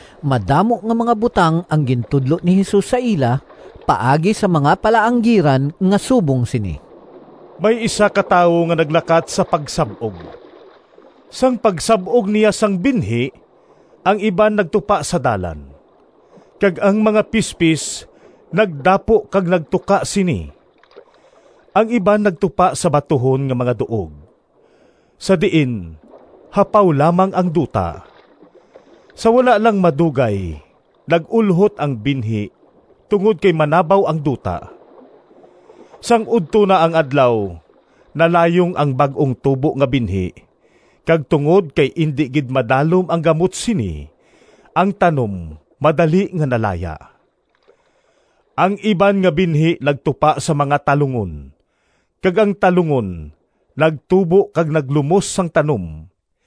Madamo nga mga butang ang gintudlo ni Jesus sa ila paagi sa mga palaanggiran nga subong sini: “May isa ka tawo nga naglakat sa pagsab-og. Sang pagsab-og niya sang binhi, ang iban nagtupa sa dalan, kag ang mga pispis nagdapo kag nagtuka sini. Ang iban nagtupa sa batuhon nga mga duog, sa diin hapaw lamang ang duta. Sa wala lang madugay nag-ulhot ang binhi tungod kay manabaw ang duta. Sang udto na ang adlaw, nalayong ang bag-ong tubo nga binhi, kag tungod kay indi gid madalom ang gamot sini, ang tanom madali nga nalaya. Ang iban nga binhi nagtupa sa mga talungon, kag ang talungon nagtubo kag naglumos sang tanom.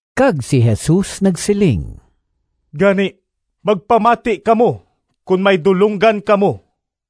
Kag si Jesus nagsiling, “Gani, magpamati kamo kon may dulonggan kamo!”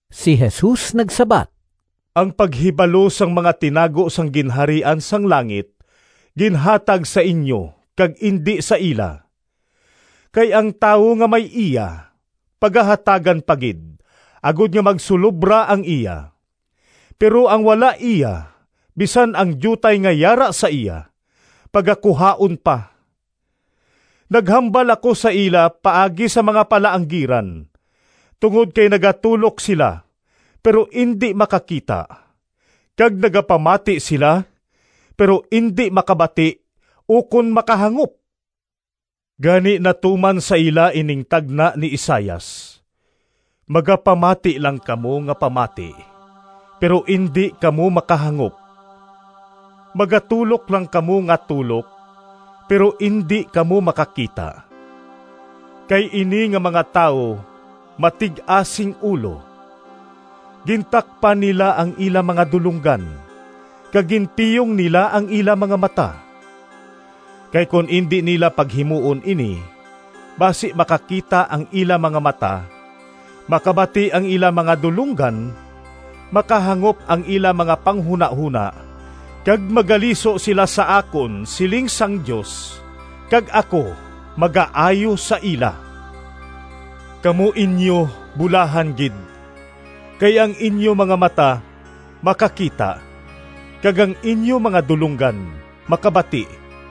Si Jesus nagsabat, “Ang paghibalo sang mga tinago sang Ginharian sang langit ginhatag sa inyo kag indi sa ila. Kay ang tawo nga may iya pagahatagan pa gid, agod nga magsulobra ang iya; pero ang wala iya bisan ang diutay nga yara sa iya pagakuhaon pa. Naghambal ako sa ila paagi sa mga palaanggiran, tungod kay nagatulok sila pero indi makakita, kag nagapamati sila pero indi makabati ukon makahangop. Gani natuman sa ila ining tagna ni Isaias: ‘Magapamati lang kamo nga pamati, Pero indi kamo makahangop, Magatulok lang kamo nga tulok, Pero indi kamo makakita. Kay ini nga mga tawo matig-a sing ulo, Gintakpan nila ang ila mga dulonggan, Kag ginpiyong nila ang ila mga mata. Kay kon indi nila paghimuon ini, Basi makakita ang ila mga mata, Makabati ang ila mga dulonggan Makahangop ang ila mga panghunahona Kag magaliso sila sa akon, Siling sang Dios, Kag ako magaayo sa ila.’ “Kamo inyo bulahan gid! Kay ang inyo mga mata makakita kag ang inyo mga dulonggan makabati.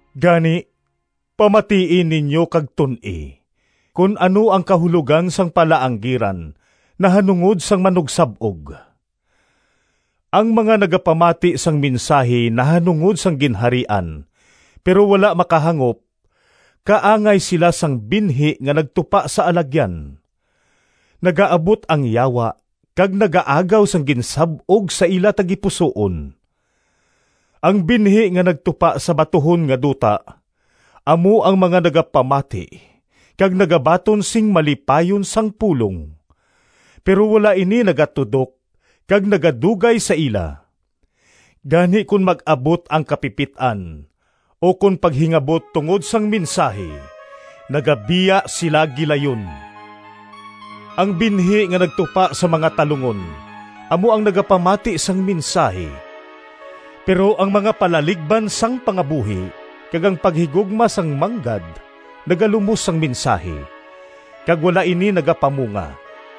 “Gani, pamatii ninyo kag tun-i kon ano ang kahulogan sang palaanggiran nahanungod sang manugsab-og. Ang mga nagapamati sang mensahi nahanungod sang Ginharian pero wala makahangop, kaangay sila sang binhi nga nagtupa sa alagyan. Nagaabot ang Yawa kag nagaagaw sang ginsab-og sa ila tagipusoon. Ang binhi nga nagtupa sa batuhon nga duta amo ang mga nagapamati kag nagabaton sing malipayon sang pulong. Pero wala ini nagatudok kag nagadugay sa ila. Gani kon mag-abot ang kapipit-an ukon paghingabot tungod sang mensahi nagabiya sila gilayon. Ang binhi nga nagtupa sa mga talungon amo ang nagapamati sang mensahi, pero ang mga palaligban sang pangabuhi, kag ang paghigugma sang manggad nagalumos sang mensahi, kag wala ini nagapamunga.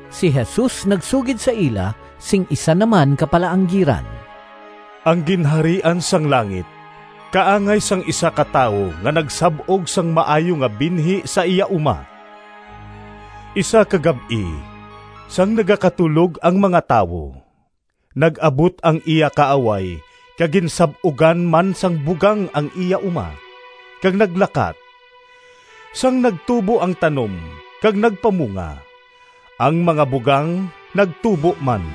Si Jesus nagsugid sa ila sing isa naman ka palaanggiran, “Ang Ginharian sang langit kaangay sang isa ka tawo nga nagsab-og sang maayo nga binhi sa iya uma. Isa ka gab-i, sang nagakatulog ang mga tawo, nag-abot ang iya kaaway kag ginsab-ugan man sang bugang ang iya uma kag naglakat. Sang nagtubo ang tanom, kag nagpamunga, ang mga bugang nagtubo man.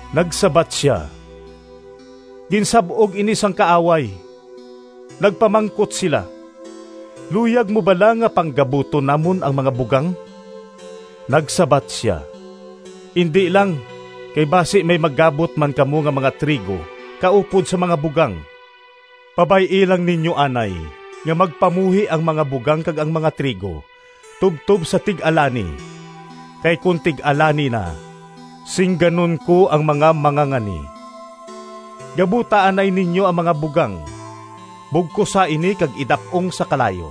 Nagsabat sia, ‘Ginsab-og ini sang kaaway.’ Nagpamangkot sila, ‘Luyag mo bala nga panggabuton namon ang mga bugang?’ Nagsabat sia, ‘Indi lang, kay basi may magabot man kamo nga mga trigo kaupod sa mga bugang. Pabay-i lang ninyo anay nga magpamuhi ang mga bugang kag ang mga trigo tubtob sa tig-alani, kay kon tig-alani na singganon ko ang mga mangangani: Gabuta anay ninyo ang mga bugang, bugkosa ini kag idap-ong sa kalayo.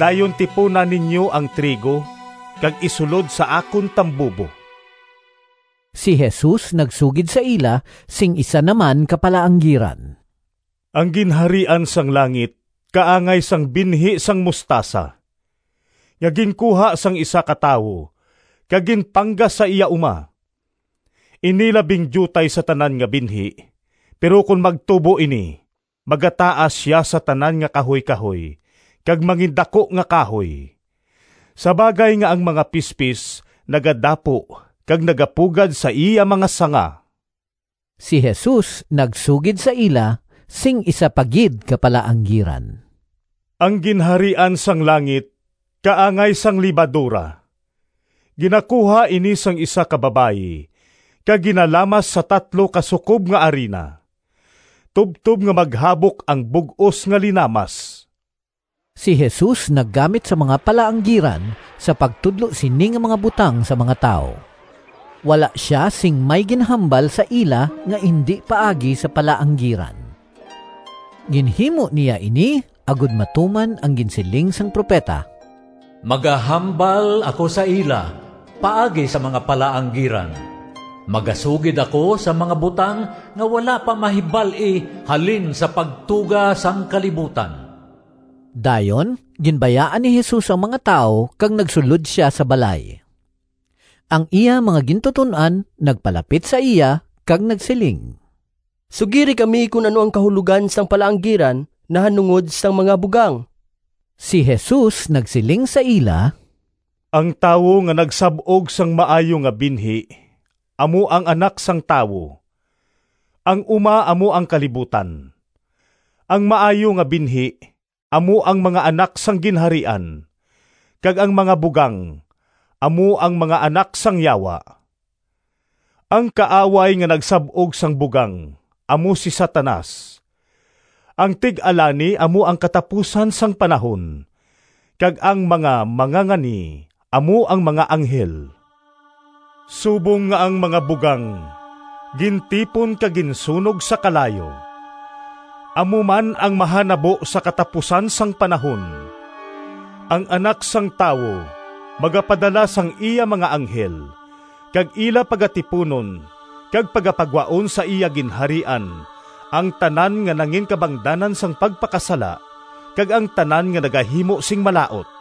Dayon tipuna ninyo ang trigo kag isulod sa akon tambubo.’” Si Jesus nagsugid sa ila sing isa naman ka palaanggiran, “Ang Ginharian sang langit kaangay sang binhi sang mostasa, nga ginkuha sang isa ka tawo kag ginpanggas sa iya uma. Ini labing diutay sa tanan nga binhi, pero kon magtubo ini magataas sia sa tanan nga kahuykahoy kag mangindaku nga kahoy, sa bagay nga ang mga pispis nagadapo kag nagapugad sa iya mga sanga.” Si Jesus nagsugid sa ila sing isa pa gid ka palaanggiran, “Ang Ginharian sang langit kaangay sang lebadora. Ginakuha ini sang isa ka babayi kag ginalamas sa tatlo ka sukob nga arina, tubtob nga maghabok ang bug-os nga linamas.” Si Jesus naggamit sang mga palaanggiran sa pagtudlo sini nga mga butang sa mga tawo. Wala sia sing may ginhambal sa ila nga indi paagi sa palaanggiran. Ginhimo niya ini agod matuman ang ginsiling sang propeta: “Magahambal ako sa ila Paagi sa mga palaanggiran, Magasugid ako sang mga butang Nga wala pa mahibal-i Halin sa pagtuga sang kalibutan.” Dayon ginbayaan ni Jesus ang mga tawo kag nagsulod sia sa balay. Ang iya mga gintuton-an nagpalapit sa iya kag nagsiling, “Sugiri kami kon ano ang kahulogan sang palaanggiran nahanungod sang mga bugang.” Si Jesus nagsiling sa ila, “Ang tawo nga nagsab-og sang maayo nga binhi amo ang Anak sang Tawo. Ang uma amo ang kalibutan. Ang maayo nga binhi amo ang mga anak sang Ginharian, kag ang mga bugang amo ang mga anak sang Yawa. Ang kaaway nga nagsab-og sang bugang amo si Satanas. Ang tig-alani amo ang katapusan sang panahon, kag ang mga mangangani amo ang mga anghel. Subong nga ang mga bugang gintipon kag ginsunog sa kalayo, amo man ang mahanabo sa katapusan sang panahon. Ang Anak sang Tawo magapadala sang iya mga anghel kag ila pagatipunon kag pagapagwaon sa iya Ginharian ang tanan nga nanginkabangdanan sang pagpakasala, kag ang tanan nga nagahimo sing malaut.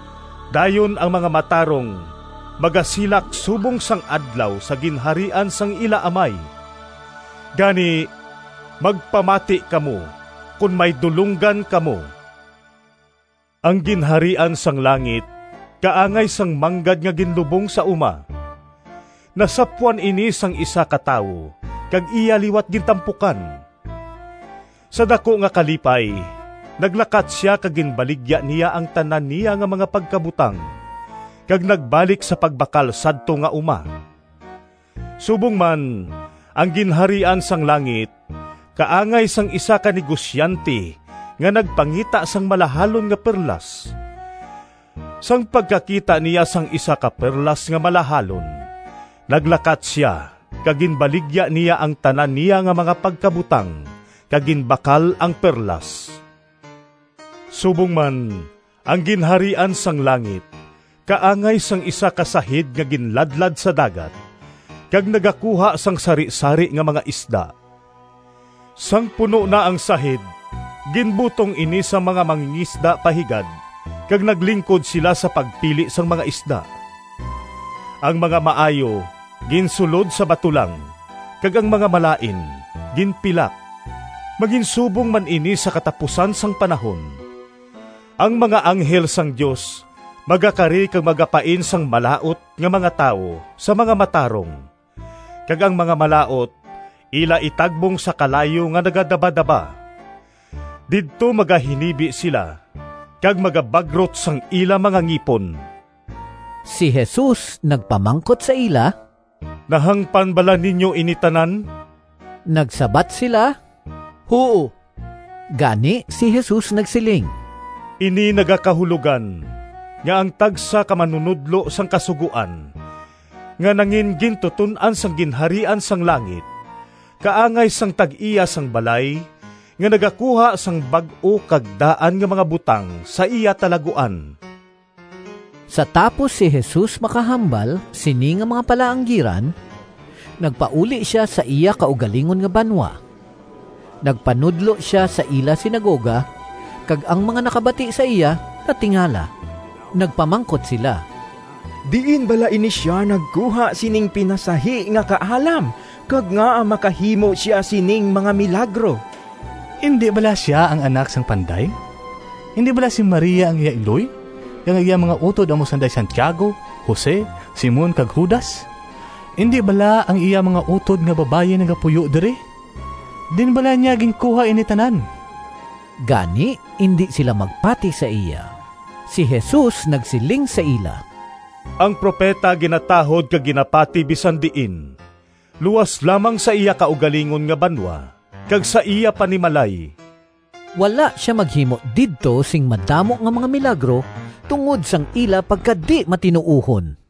Dayon ang mga matarong magasilak subong sang adlaw sa Ginharian sang ila Amay. Gani, magpamati kamo kon may dulonggan kamo!” “Ang Ginharian sang langit kaangay sang manggad nga ginlubong sa uma. Nasapwan ini sang isa ka tawo kag iya liwat gintampukan. Sa daku nga kalipay naglakat sia kag ginbaligya niya ang tanan niya nga mga pagkabutang, kag nagbalik sa pagbakal sadto nga uma.” “Subong man, ang Ginharian sang langit kaangay sang isa ka negosyante nga nagpangita sang malahalon nga perlas. Sang pagkakita niya sang isa ka perlas nga malahalon, naglakat sia kag ginbaligya niya ang tanan niya nga mga pagkabutang kag ginbakal ang perlas.” “Subong man, ang Ginharian sang langit kaangay sang isa ka sahid nga ginladlad sa dagat, kag nagakuha sang sarisari nga mga isda. Sang puno na ang sahid ginbutong ini sang mga mangingisda pa higad kag naglingkod sila sa pagpili sang mga isda. Ang mga maayo ginsulod sa batulang kag ang mga malain ginpilak. Manginsubong man ini sa katapusan sang panahon. Ang mga anghel sang Dios magakari kag magapain sang malaut nga mga tawo sa mga matarong, kag ang mga malaut ila itagbong sa kalayo nga nagadabadaba. Didto magahinibi sila kag magabagrot sang ila mga ngipon.” Si Jesus nagpamangkot sa ila, “Nahangpan bala ninyo ini tanan?” Nagsabat sila, “Huo.” Gani si Jesus nagsiling, “Ini nagakahulogan, nga ang tagsa ka manunodlo sang Kasugoan nga nangingintuton-an sang Ginharian sang langit kaangay sang tag-iya sang balay nga nagakuha sang bag-o kag daan nga mga butang sa iya talaguan.” Sa tapos si Jesus makahambal sini nga mga palaanggiran, nagpauli sia sa iya kaugalingon nga banwa. Nagpanudlo sia sa ila sinagoga, kag ang mga nakabati sa iya natingala. Nagpamangkot sila, “Diin bala ini sia nagkuha sining pinasahi nga kaalam kag ngaa makahimo sia sining mga milagro? Indi bala sia ang anak sang panday? Indi bala si Maria ang iya iloy, kag ang iya mga utod amo sanday Santiago, Jose, Simon kag Judas? Indi bala ang iya mga utod nga babayi nagapuyo diri? Diin bala niya ginkuha ini tanan?” Gani indi sila magpati sa iya. Si Jesus nagsiling sa ila, “Ang propeta ginatahod kag ginapati bisan diin, luas lamang sa iya kaugalingon nga banwa kag sa iya panimalay.” Wala sia maghimo didto sing madamo nga mga milagro tungod sang ila pagkadimatinuohon.